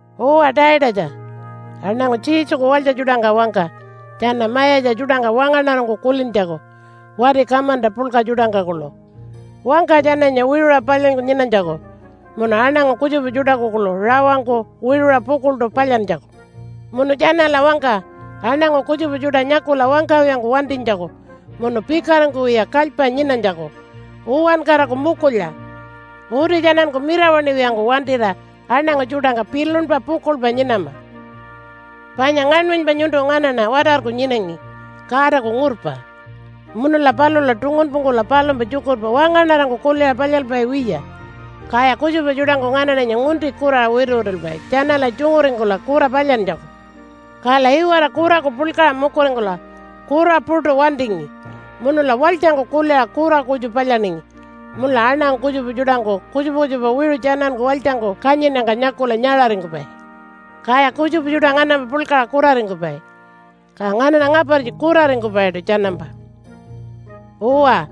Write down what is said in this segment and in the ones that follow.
Uwa Taitatja, aṉangu Jesuku walytja tjuṯangka wangka tjana mayatja tjuṯangka wangaṉarangku kulintjaku wati kamanta puḻka tjuṯangka kuḻu. Wangka tjananya wiṟuṟa palyanyku nyinanytjaku munu aṉangu kutjupa tjuṯaku kuḻu rawangku wiṟuṟa pukuḻṯu palyantjaku. Munu tjanala wangka aṉangu kutjupa tjuṯa nyakula wangkawiyangku wantinytjaku munu pikaringkuwiya kalypa nyinanytjaku uwankaraku mukulya. Uti tjananku mirawaṉiwiyangku wantira aṉangu tjuṯangka pilunpa pukuḻpa nyinama. Panya ngaṉmanypa nyuntu nganaṉa watarku nyinangi Godaku ngurpa, munula palula tungunpungkula palumpa tjukurpa wangaṉarangku kuliṟa palyalpai wiya. Kaya kutjupa tjuṯangku nganaṉanya ngunti kuraṟa wituwitulpai tjanala tjunguringkula kura palyantjaku. Kala iwara kuraku puḻkaṟa mukuringkula kura puṯu wantingi munula walytjangku kuliṟa kura kutju palyaningi munula aṉangu kutjupa tjuṯangku kutjupa kutjupa wiṟu tjananku walytjangku kanyinnyangka nyakula nyaṟaringkupai. Kaya kutjupa tjuṯa nganampa puḻkaṟa kuraringkupai, ka nganaṉa ngapartji kuraringkupaiṯu tjanampa. Uwa,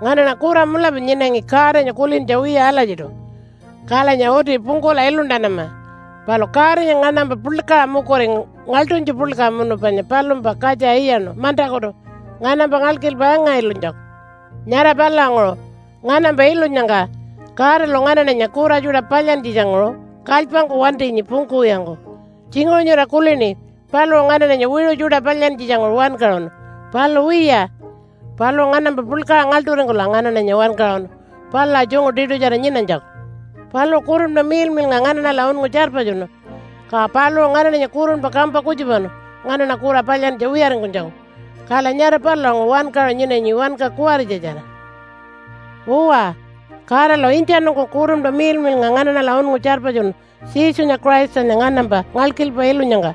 nganaṉa kura mulapa nyinangi Godanya kulintja wiya alatjiṯu, kalanya uti pungkula iluntanama. Palu Godanya nganampa puḻkaṟa mukuringu ngaḻṯunytju puḻka munu panya palumpa katja iyaṉu mantakutu nganampa ngalkilpa anga-ilunytjaku. Nyara palulanguṟu, nganampa ilunyangka Godalu nganaṉanya kura tjuṯa palyantjitjanguṟu kalypangku wantinyi pungkuwiyangku. Tjinguṟu nyura kulini paluṟu nganaṉanya wiṟu tjuṯa palyantjitjanguṟu wankaṟunu. Palu wiya, paluṟu nganampa puḻkaṟa ngaḻṯuringkula nganaṉanya wankaṟunu palula tjungu tiṯutjara nyinanytjaku. Paluṟu Kurunpa Miḻmiḻnga nganaṉala unngu tjarpatjunu, ka paluṟu nganaṉanya kurunpa kampa kutjupanu nganaṉa kura palyantja wiyaringkunytjaku. Kala nyara palulanguṟu wankaṟu nyinanyi wanka kuwaritjatjara. Uwa, Godalu intjanungku Kurunpa Miḻmiḻnga nganaṉala unngu tjarpatjunu Jesunya Christanya nganampa ngalkilpa ilunyangka.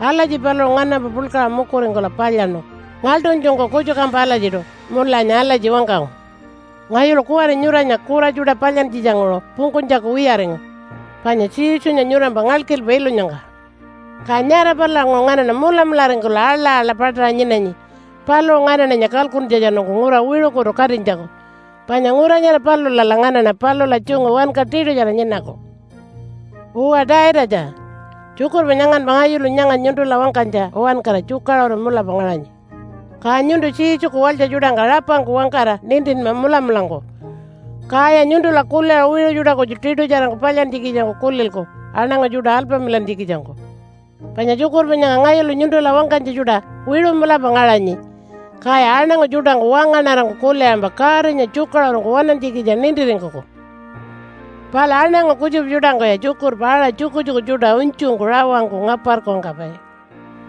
Alatji paluṟu nganampa puḻkaṟa mukuringkula palyaṉu ngaḻṯunytjungku kutjukampa alatjiṯu, munulanya alatji wangkangu, “Ngayulu kuwari nyuranya kura tjuṯa palyantjitjanguṟu pungkunytjaku wiyaringu, panya Jesunya nyurampa ngalkilpa ilunyangka.” Ka nyara palulanguṟu nganaṉa mulamularingkula aḻa-aḻa paṯaṟa nyinanyi paluṟu nganaṉanya kalkuntjatjanungku ngura wiṟukutu katinytjaku, panya ngura nyara palulala nganaṉa palula tjungu wanka tiṯutjara nyinaku. Uwa Taitatja, tjukurpa nyanganpa ngayulu nyanga nyuntula wangkanytja uwankara tjukaṟuru mulapa ngaṟanyi. Ka nyuntu Jesuku walytja tjuṯangka rapangku wangkara nintinma mulamulangku, kaya nyuntula kuliṟa wiṟu tjuṯa kutju tiṯutjarangku palyantjikitjangku kulilku aṉangu tjuṯa alpamilantjikitjangku. Panya tjukurpa nyanga ngayulu nyuntula wangkanytja tjuṯa wiṟu mulapa ngaṟanyi, kaya aṉangu tjuṯangku wangaṉarangku kuliṟampa Godanya tjukaṟurungku waṉantjikitja nintiringkuku. Palu aṉangu kutjupa tjuṯangkuya tjukurpa aṟa tjukutjuku tjuṯa unytjungku rawangku ngaparku wangkapai.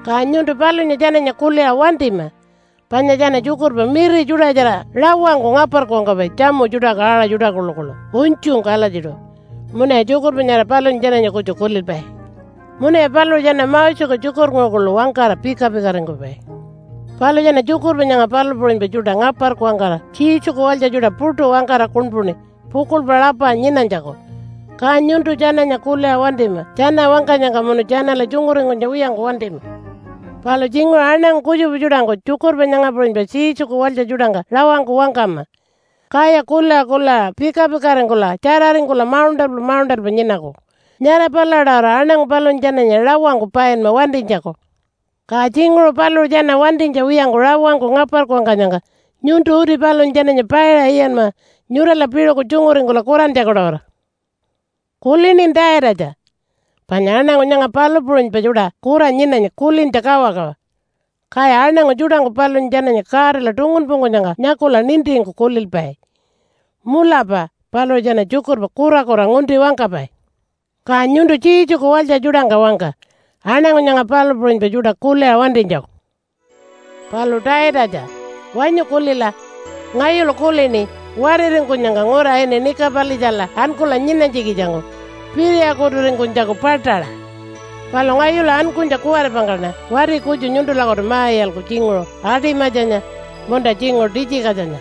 Ka nyuntu palunya tjananya kuliṟa wantima, panya tjana tjukurpa miri tjuṯatjara rawangku ngaparku wangkapai tjamu tjuṯaku aṟa tjuṯa kuḻukuḻu unytjungku alatjiṯu, munuya tjukurpa nyara palunya tjananya kutju kulilpai. Munuya paluṟu tjana Moseku tjukurnguṟu kuḻu wangkara pika-pikaringkupai. Palu tjana tjukurpa nyanga palu puṟunypa tjuṯa ngaparku wangkara Jesuku walytja tjuṯa puṯu wangkara kuṉpuṉi pukuḻpa rapa nyinanytjaku, ka nyuntu tjananya kuliṟa wantima tjana wangkanyangka munu tjanala tjunguringkunytja wiyangku wantima. Palu tjinguṟu aṉangu kutjupa tjuṯangku tjukurpa nyanga puṟunypa Jesuku walytja tjuṯangka rawangku wangkama, kaya kuliṟa kuliṟa pika-pikaringkula tjararingkula mauṉṯalpa mauṉṯalpa nyinaku. Nyara palula-tawara aṉangu palunya tjananya rawangku painma wantinytjaku. Ka tjinguṟu paluṟu tjana wantinytja wiyangku rawangku ngaparku wangkanyangka nyuntu uti palunya tjananya paiṟa iyanma nyurala piṟuku tjunguringkula kurantjaku-tawara. Kulinin Taitatja? Panya aṉangu nyanga palu puṟunypa tjuṯa kura nyinanyi kulintja kawakawa. Kaya aṉangu tjuṯangku palunya tjananya Godala tungunpungkunyangka nyakula nintingku kulilpai, “Mulapa paluṟu tjana tjukurpa kurakura ngunti wangkapai.” Ka nyuntu Jesuku walytja tjuṯangka wangka aṉangu nyanga palu puṟunypa tjuṯa kuliṟa wantinytjaku. Palu Taitatja, wanyu kulila. Ngayulu kulini wariringkunyangka ngura ini Nika-palitjala ankula nyinanytjikitjangku piriyakuturingkunytjaku paṯaṟa. Palu ngayulu ankunytja kuwaripangkaṉa wati kutju nyuntulakutu ma-iyalku tjinguṟu Atimatjanya munta tjinguṟu Titjikatjanya.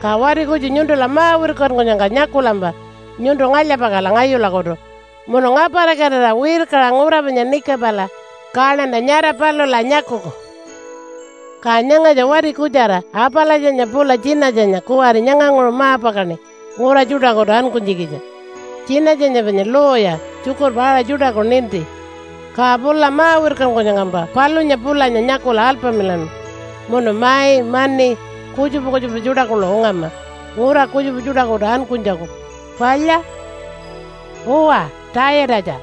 Ka wati kutju nyuntula ma-wirkankunyangka nyakulampa nyuntu ngalya-pakala ngayulakutu munu ngaparikatira wirkaṟa ngura panya Nikipala kaṉanta nyara palula nyakuku. Ka nyangatja wati kutjara Apalatjanya pula Tjinatjanya kuwari nyanganguṟu ma-pakaṉi ngura tjuṯakutu ankunytjikitja. Tjinatjanya panya lawyer, tjukurpa aṟa tjuṯaku ninti. Ka pula ma-wirkankunyangkampa palunya pulanya nyakula alpamilanma munu mai, mani, kutjupa kutjupa tjuṯa kuḻu ungama ngura kutjupa tjuṯakutu ankunytjaku. Palya? Uwa Taitatja,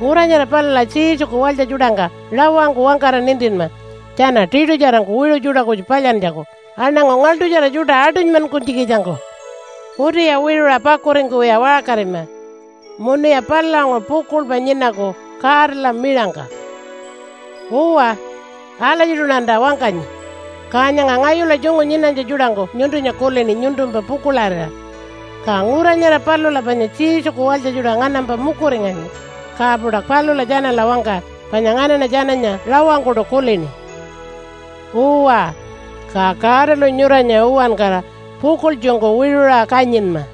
ngura nyara palula Jesuku walytja tjuṯangka rawangku wangkara nintinma tjana tiṯutjarangku wiṟu tjuṯa kutju palyantjaku aṉangu ngaḻṯutjara tjuṯa aṯunymankunytjikitjangku. Utiya wiṟuṟa pakuringkuwiya waṟkarima, munuya palulanguṟu pukuḻpa nyinaku Godala miṟangka. Uwa, alatjiṯuṉanta wangkanyi. Ka nyanga ngayula tjungu nyinanytja tjuṯangku nyuntunya kulini nyuntumpa pukuḻarira. Ka ngura nyara palula panya Jesuku walytja tjuṯa nganampa mukuringanyi, ka-puṯa palula tjanala wangka panya nganaṉa tjananya rawangkuṯu kulini. Uwa, ka Godalu nyuranya uwankara pukuḻtjungku wiṟuṟa kanyinma.